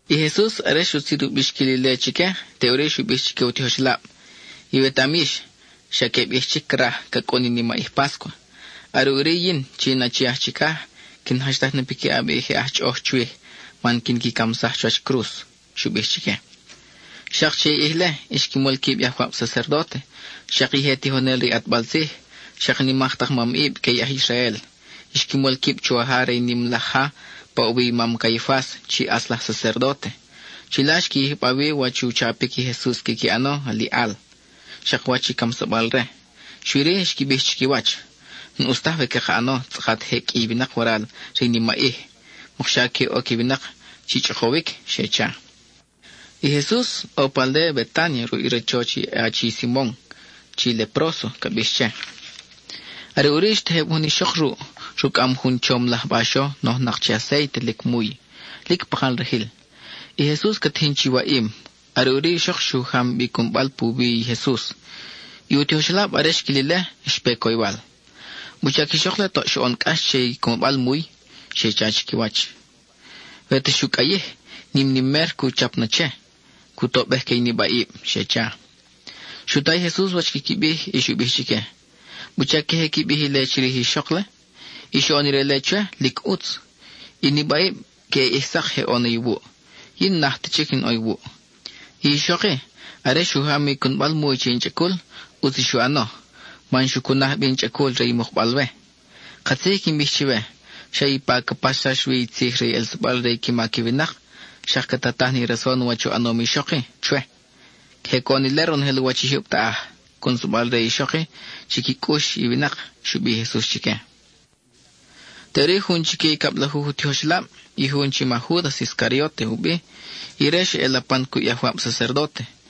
I Jesus, are xutzin u bixquil ile chique, teʼuri xu bij chique u tijoxelab: —Iwetaʼam yix, xa queb ʼij chic craj, ca cʼun i nimaʼij páscua. Are ʼuri yin, chi in Achi aj Chicaj quin jachtaj na piquiʼab i je aj chʼoʼoj chwij man quin qui camsaj chuwach cruz —xu bij chique. Xak che i ʼij-le, xqui mol quib i ajwab sacerdóte, xak i je tijonel re i ʼatbal tzij, xak i nimak tak mamʼib que i aj Israel. Xqui mol quib chuwaja re i nim laj ja pa ʼo wi i mam Caifas chi ʼatz laj sacerdóte. Chila xqui yijba wi wach u chapic i Jesus quiqui ʼano aliʼal, xak wach i camsabal-re. Xui-ri, xqui bij chiquiwach: —N-ʼus taj we caka ʼano tzʼakat je qʼui i winak waral re i nimaʼij, mokxa que oc i winak chi chʼokowic —xe cha. I Jesus ʼo pa aldéa Betánia ruʼ i rachoch i achi Simon, chi “Lepróso” ca bix che. Are ʼuri xtejeb jun ixok ruʼ, rucʼam jun chom laj baxo nojnak che acéite lic muy, lic pakal rajil. I Jesus ca tijin chi waʼim, are ʼuri i ixok xu jam bi i cunbal puwi i Jesus. I u tijoxelab, are xquil ile, xpe coywal. —¿Wuchac i ixok-le toʼ xoʼon cʼax che i cunbal muy? —xe cha chiquiwach—. We ta xu cʼayij, nim ni mer cu chap na che, cu tobej que i nibaʼib —xe cha. Xu ta i Jesus wach quiqui bij y xu bij chique: —¿Wuchac queje qui bij ile chirij i ixok-le? I xoʼon ire-le chwe, lic ʼutz. I nibaʼib, queʼe ʼij sak je ʼo na iwuʼ; yin n-naj ta chic in ʼo iwuʼ. I ixok-i, are xu jam i cunbal muy che in chʼacul, ʼutz i xu ʼano, man xu cunaj bi in chʼacul re i mukbal-we. Katzij i quin bij chiwe, xa ipa ca paxsax wi i tzij re i ʼelsabal re i qui mac i winak xak ca tataj ni rason wach u ʼanom i ixok-i chwe. Queje coʼon ile ronojel u wach i jyub taʼaj, cʼunsabal re i ixok-i chi qui cʼux i winak —xu bij i Jesus chique. Teʼuri, jun chique i cablajuj u tijoxelab, i jun chi ma Júdas Iscarióte u bi, ire xa ʼe lapan cuʼ i ajwab sacerdóte.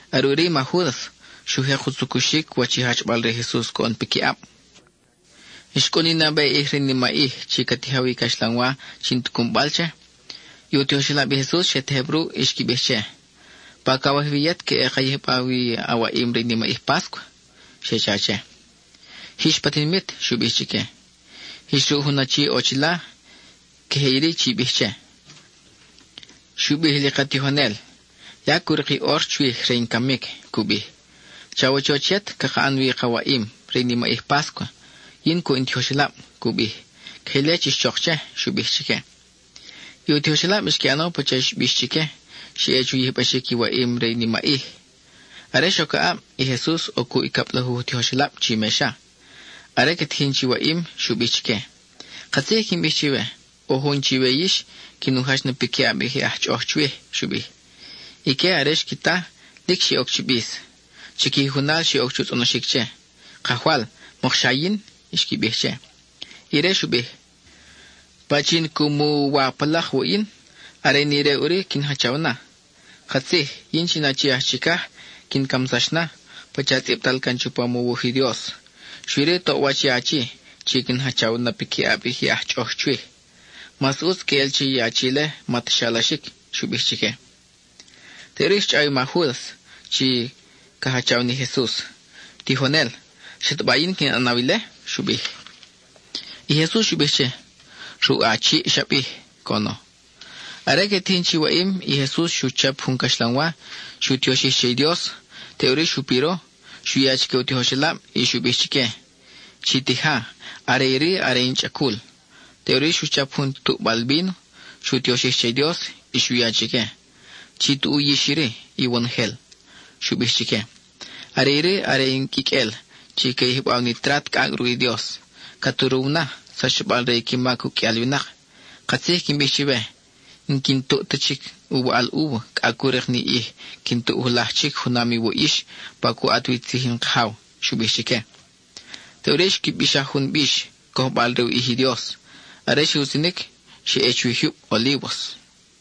Are ʼuri i ma Júdas xu jek u tzucuxic wach i jachbal re i Jesus coʼon piquiʼab. Xcʼun i nabe ʼij re i nimaʼij chi ca tijaw i caxlanwa chi n-ti cunbal che. I u tijoxelab i Jesus xe tejeb ruʼ y xqui bij che: —¿Pa cawaj wi yet queʼe ka yijba wi i a waʼim re i nimaʼij páscua? —xe cha che. —Jix pa tinimit —xu bij chique—. Jix ruʼ jun achi ʼo chila y queje iri chi bij che: “Xu bij li ka tijonel: Ya cu rik i ʼor chwij re in camic, cu bij. Chawachoch yet caka ʼan wi ka waʼim re i nimaʼij páscua, yin cuʼ in tijoxelab, cu bij.” Queje ile chix chok che —xu bij chique. I u tijoxelab xqui ʼano pacha i xbix chique. Xe ʼe chu yijbaxic i waʼim re i nimaʼij. Are xoc aʼab, i Jesus ʼo cuʼ i cablajuj u tijoxelab chi mexa. Are que tijin chi waʼim, xu bij chique: —Katzij i quin bij chiwe, ʼo jun chiwe yix quin u jach na piquiʼab i je aj chʼoʼoj chwij —xu bij. Ique, are xqui ta, lic xe oc chi bis. Chiqui jujunal xe oc chu tzʼonoxic che: —Kajwal, ¿mokxa yin? —xqui bij che. Ire xu bij: —Pachin cu mu u wa pa lak wuʼ yin, are ni ire ʼuri quin jachaw na. Katzij, yin chi in Achi aj chicaj, quin camsax na, pacha tzʼibtal can chupam u wuj i Dios, xui-ri toʼwach i achi chi quin jachaw na piquiʼab i aj chʼoʼoj chwij. Mas ʼutz queʼel che i achi-le ma ta xalaxic —xu bij chique. Teʼuri xchʼaw i ma Júdas, chi ca jachaw ni Jesus: —Tijonel, ¿xataba yin quin ʼanaw ile? —xu bij. I Jesus xu bij che: —Ruʼ a chiʼ xa bij —coʼono. Are que tijin chi waʼim, i Jesus xu chap jun caxlanwa, xu tioxij che i Dios, teʼuri xu piro. Xu ya chique u tijoxelab, y xu bij chique: —Chi tija, are iri are in chʼacul. Teʼuri xu chap jun tuʼbal víno, xu tioxij che i Dios, y xu ya chique. —Chi tuʼu yix iri, iwonojel —xu bij chique—. Are iri are in quiqʼuel chi ca yijbaw ni trat cʼacʼ ruʼ i Dios. Ca turuw na, sachsabal re i qui mac uqʼuial winak. Katzij quin bij chiwe, n-quin tuʼ ta chic u waʼal úva, cʼa cu rik ni ʼij quin tuʼ julaj chic junam iwuʼ yix, pa cu ʼat wi tzij in Kajaw —xu bij chique. Teʼuri xqui bixaj jun bix, cojbal re u ʼij i Dios; are xe utzinic, xe ʼe chuwi jyub Olívos.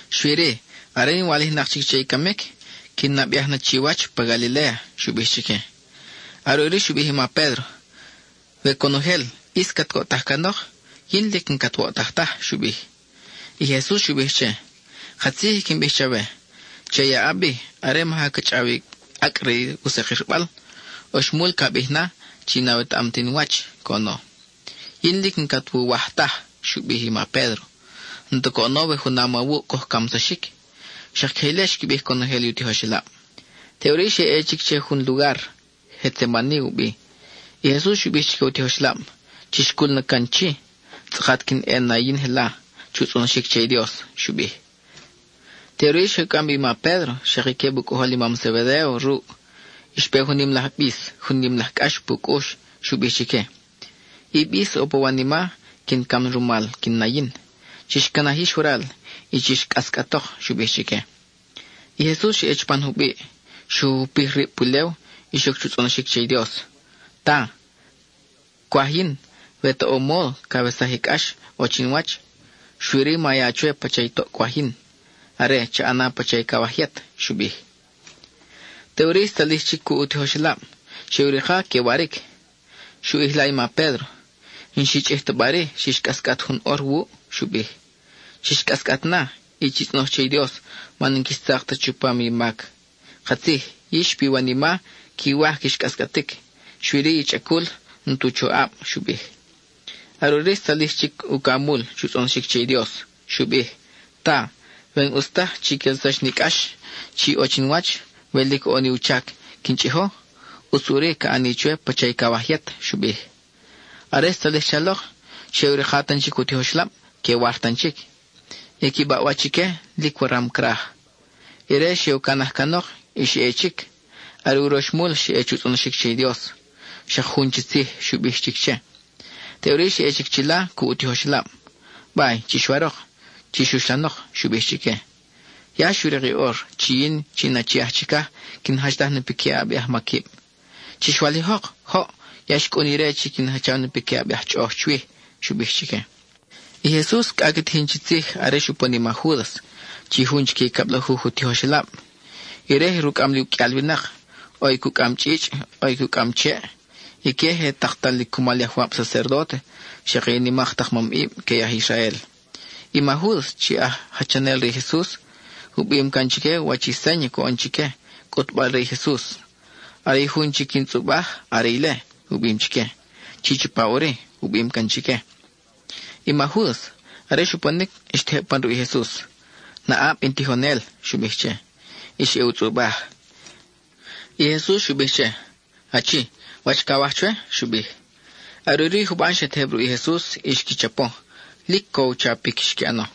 Xui-ri, are in walijnak chic che i camic, quin nabeaj na chiwach pa Galiléa —xu bij chique. Are ʼuri xu bij i ma Pédro: —We conojel ʼis cat coʼtaj canok, yin lic n-cat woʼtaj taj —xu bij. I Jesus xu bij che: —Katzij i quin bij chawe, che i aʼab-i, are maja ca chʼaw i acʼ re u sakirbal, oxmul ca bij na, chi n-awetaʼam ta in wach —coʼono. —Yin lic n-cat wuwaj taj —xu bij i ma Pédro— n-ta coʼono we junam awuʼ coj camsaxic. Xak queje ile xqui bij conojel i u tijoxelab. Teʼuri xe ʼe chic che jun lugar, Getsemani u bi. I Jesus xu bij chique u tijoxelab: —Chix cul na can chi, tzʼakat quin ʼe na yin jela chu tzʼonoxic che i Dios —xu bij. Teʼuri xe u cʼam bi i ma Pédro, xak i queb u cʼojol i mam Zebedéo ruʼ, y xpe jun nim laj bis, jun nim laj cʼax pu cʼux. Xu bij chique: —I bis ʼo pa wanima, quin cam rumal, quin na yin. Chix canaj yix waral y chix cʼascʼatok —xu bij chique. I Jesus xa ʼe chupan jubiʼ, xu jupij rib pulew, y xoc chu tzʼonoxic che i Dios: —Ta, cwaj yin, we ta ʼo módo, cawesaj i cʼax ʼo chinwach. Xui-ri, ma ya chwe pacha i toʼ cwaj yin; are, cha ʼana pacha i cawaj yet —xu bij. Teʼuri xtzalij chic cuʼ i u tijoxelab; xe u rika que waric. Xu ʼijla i ma Pédro: —¿N-xi chʼij ta bari xix cʼascʼat jun ʼor wuʼ? —xu bij—. Chix cʼascʼat na, y chi tzʼonoj che i Dios man n-quix tzak ta chupam i mac. Katzij, yix piwanima quiwaj quix cʼascʼatic, xui-ri i chʼacul n-tu choʼab —xu bij. Are ʼuri xtzalij chic ucamul chu tzʼonoxic che i Dios. Xu bij: —Ta, we n-ʼus taj chi quelsax ni cʼax chi ʼo chinwach, we lic ʼo ni u chac quin chʼijo, ʼutz ʼuri ca ʼani chwe pacha i cawaj yet —xu bij. Are xtzalij chalok, xe ʼe u rika tan chic u tijoxelab que war tan chic; i qui baʼwach ique lic waram craj. Ire xe u canaj canok, y xa ʼe chic; are uroxmul xa ʼe chu tzʼonoxic che i Dios, xak jun chi tzij xu bij chic che. Teʼuri xa ʼe chic chila cuʼ u tijoxelab. —Bay, chix warok; chix uxlanok —xu bij chique—. Ya xu rik i ʼor chi yin, chi in Achi aj Chicaj, quin jachtaj na piquiʼab i ajmaquib. Chix walijok. Joʼ. Ya xcʼun ire chi quin jachaw na piquiʼab i aj chʼoʼoj chwij —xu bij chique. I Jesus cʼa ca tijin chi tzij are xupon i ma Júdas, chi jun chique i cablajuj u tijoxelab. Ire je rucʼam li uqʼuial winak; ʼo i cucʼam chʼichʼ, ʼo i cucʼam cheʼ. Ique je taktal li cumal i ajwab sacerdóte xak i nimak tak mamʼib que i aj Israel. I ma Júdas, chi aj jachanel re i Jesus, u bim can chique wach i séña coʼon chique, cʼutbal re i Jesus: “Are i jun chi quin tzʼubaj, are ile,” u bim chique. “Chi chapa ʼuri,” u bim can chique. I ma Júdas, are xuponic, xtejeb pan ruʼ i Jesus. —Naʼab, in Tijonel —xu bij che. Y xa ʼe u tzʼubaj. I Jesus xu bij che: —Achi, ¿Wach cawaj chwe? —xu bij. Are ʼuri i juban xe tejeb ruʼ i Jesus y xqui chapo; lic co i u chapic xqui ʼano.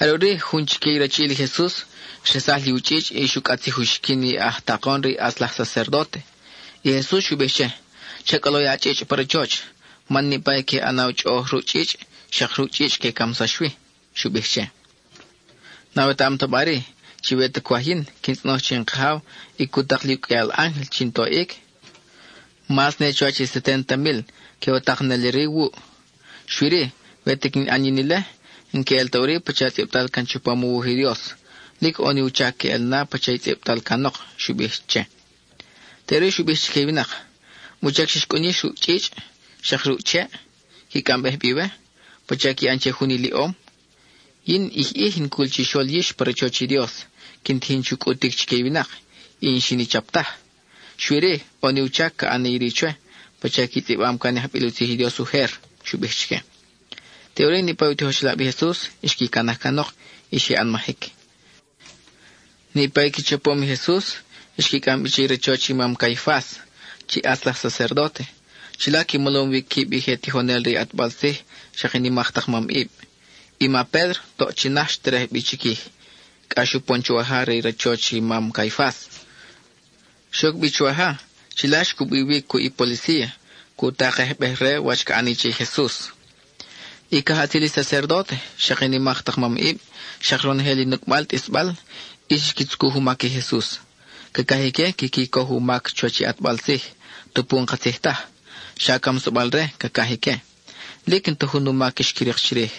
Are ʼuri, jun chique i rachiʼil i Jesus xresaj li u chʼichʼ y xu cʼatzij u xiquin i aj takon re i ʼatz laj sacerdóte. I Jesus xu bij che: —Cha cʼolo a chʼichʼ pa rachoch, man niʼpa i que ʼanaw chʼoʼoj ruʼ chʼichʼ, xak ruʼ chʼichʼ que camsax wi —xu bij che—. ¿N-awetaʼam ta bari, chi we ta cwaj yin, quin tzʼonoj che in Kajaw y cu tak li uqʼuial ángel chin toʼic? ¡Mas ne chuwach i seténta mil que u tak neli-ri wuʼ! Xui-ri, we ta quin ʼan yin ile, n-queʼel ta ʼuri pacha tzʼibtal can chupam u wuj i Dios. Lic ʼo ni u chac queʼel na pacha i tzʼibtal canok —xu bij che. Teʼuri xu bij chique i winak: —¿Wuchac xix cʼun yix ruʼ i chʼichʼ xak ruʼ i cheʼ, qui cʼambej bi we, pacha qui ʼan che jun iliʼom? Yin ʼij ʼij in cul chixol yix pa rachoch i Dios, quin tijin chu cʼutic chique i winak, y n-xin i chap taj. Xui-ri, ʼo ni u chac ca ʼani iri chwe, pacha qui tzʼibam can i ajbil u tzij i Dios ujer —xu bij chique. Teʼuri, niʼpa i u tijoxelab i Jesus xqui canaj canok y xe ʼanmajic. Niʼpa i qui chapom i Jesus, xqui cʼam bi che i rachoch i mam Caifas, chi ʼatz laj sacerdóte. Chila qui molom wi quib i je tijonel re i ʼatbal tzij xak i nimak tak mamʼib. I ma Pédro, toʼ chi naj xterej bi chiquij, cʼa xupon chuwaja re i rachoch i mam Caifas. Xoc bi chuwaja, chila xcubi wi cuʼ i policía, cu takejbej-re wach ca ʼani che i Jesus. I cajʼatzil i sacerdóte, xak i nimak tak mamʼib, xak ronojel i nucʼbal tʼisbal, ʼis xqui tzucuj u mac i Jesus. Cacaj ique quiqui coj u mac chuwach i ʼatbal tzij, tupu n-katzij taj, xa camsabel-re cacaj ique. Lic n-ta jun u mac xqui rik chirij,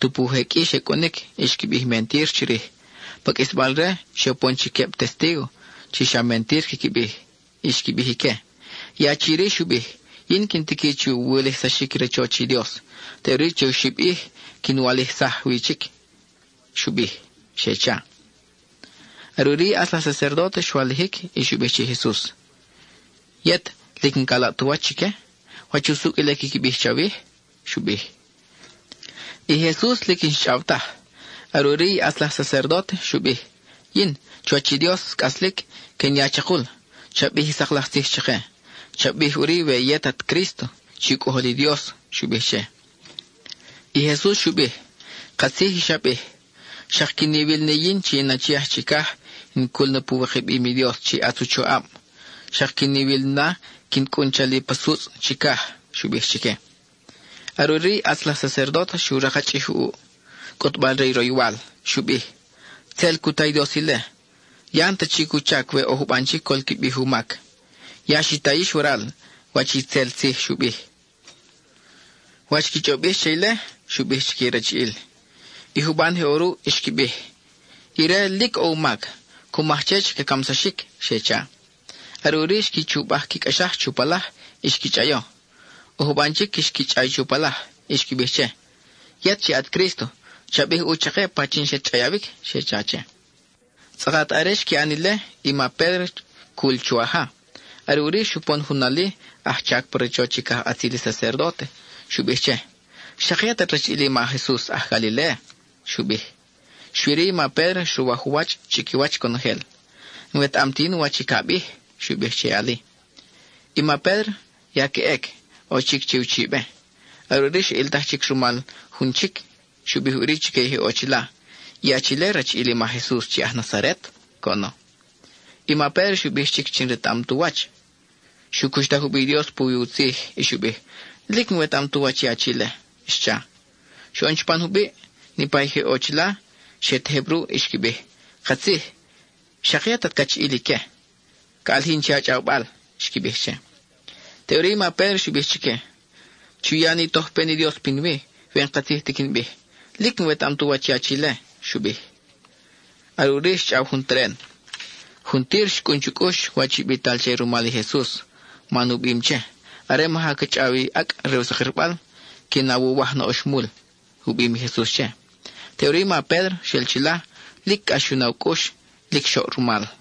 tupu je qʼui xe cʼunic y xqui bij mentir chirij. Pa qʼuisbal-re, xe upon chic queb testígo chi xa mentir quiqui bij. Xqui bij ique: —I achi-ri xu bij: “Yin quin tiqui chu wulijsaxic i rachoch i Dios, teʼuri che oxib ʼij quin walijsaj wi chic,” xu bij —xe cha. Are ʼuri i ʼatz laj sacerdóte xwalijic, y xu bij che i Jesus: —Yet, ¿lic n-ca laʼ tu wach chique? ¿Wach usucʼ ile quiqui bij chawij? —xu bij. I Jesus lic n-xchʼaw taj. Are ʼuri i ʼatz laj sacerdóte xu bij: —Yin, chuwach i Dios cʼaslic, quin ya chakul: cha bij i sak laj tzij chake; cha bij ʼuri we yet at Crísto, chi u Cʼojol i Dios —xu bij che. I Jesus xu bij: —Katzij i xa bij. Xak quin iwil ni yin chi in Achi aj Chicaj, in cul na pu wikabim i Dios chi ʼatz u choʼab; xak quin iwil na quin cʼun chali pa sutzʼ chicaj —xu bij chique. Are ʼuri i ʼatz laj sacerdóte xu rakchʼij u ʼuʼ, cʼutbal-re i roywal. Xu bij: —¡Tzel cu ta i Dios ile! ¡Ya n-ta chic u chac we ʼo juban chic col qui bij u mac! Ya xi ta yix waral wach i itzel tzij xu bij. ¿Wach qui chʼob yix che ile? —xu bij chique i rachiʼil. I juban je ʼo ruʼ xqui bij: —Ire lic ʼo u mac; cu maj che chi ca camsaxic —xe cha. Are ʼuri xqui chubaj qui cʼaxaj chu palaj y xqui chʼayo. ʼO juban chic xqui chʼay chu palaj y xqui bij che: —Yet chi at Crísto, cha bij ʼu chake pachin xat chʼayawic —xe cha che. Tzʼakat are xqui ʼan ile, i ma Pédro cul chuwaja. Are ʼuri, xupon jun ali, aj chac pa rachoch i cajʼatzil i sacerdóte; xu bij che: —Xak yet at rachiʼil i ma Jesus aj Galiléa —xu bij. Xui-ri, i ma Pédro xruwaj u wach chiquiwach conojel: —N-wetaʼam ti yin wach i ca bij —xu bij che i ali. I ma Pédro ya ca ʼec, ʼo chic che uchibe. Are ʼuri xa ʼiltaj chic rumal jun chic. Xu bij ʼuri chique i je ʼo chila: —I achi-le, rachiʼil i ma Jesus chi aj Nazaret —coʼono. I ma Pédro xu bij chic chi n-retaʼam tu wach. Xu cuxtaj u bi i Dios puwi u tzij y xu bij: —Lic n-wetaʼam tu wach i achi-le —xcha. Xoʼon chupan jubiʼ, niʼpa i je ʼo chila xe tejeb ruʼ y xqui bij: —Katzij, xak yet at cachiʼil ique. Ca ʼalijin che a chʼawbal —xqui bij che. Teʼuri i ma Pédro xu bij chique: —Chu ya ni tojpen i Dios pinwi, we n-katzij ti quin bij. Lic n-wetaʼam tu wach i achi-le —xu bij. Are ʼuri xchʼaw jun teren. Juntir xcʼun chu cʼux wach i bital che rumal i Jesus, man u bim che: “Are maja ca chʼaw i acʼ re u sakirbal, quin awuwaj na oxmul,” u bim i Jesus che. Teʼuri i ma Pédro xel chila, lic cʼax xu na u cʼux, lic xoʼ rumal.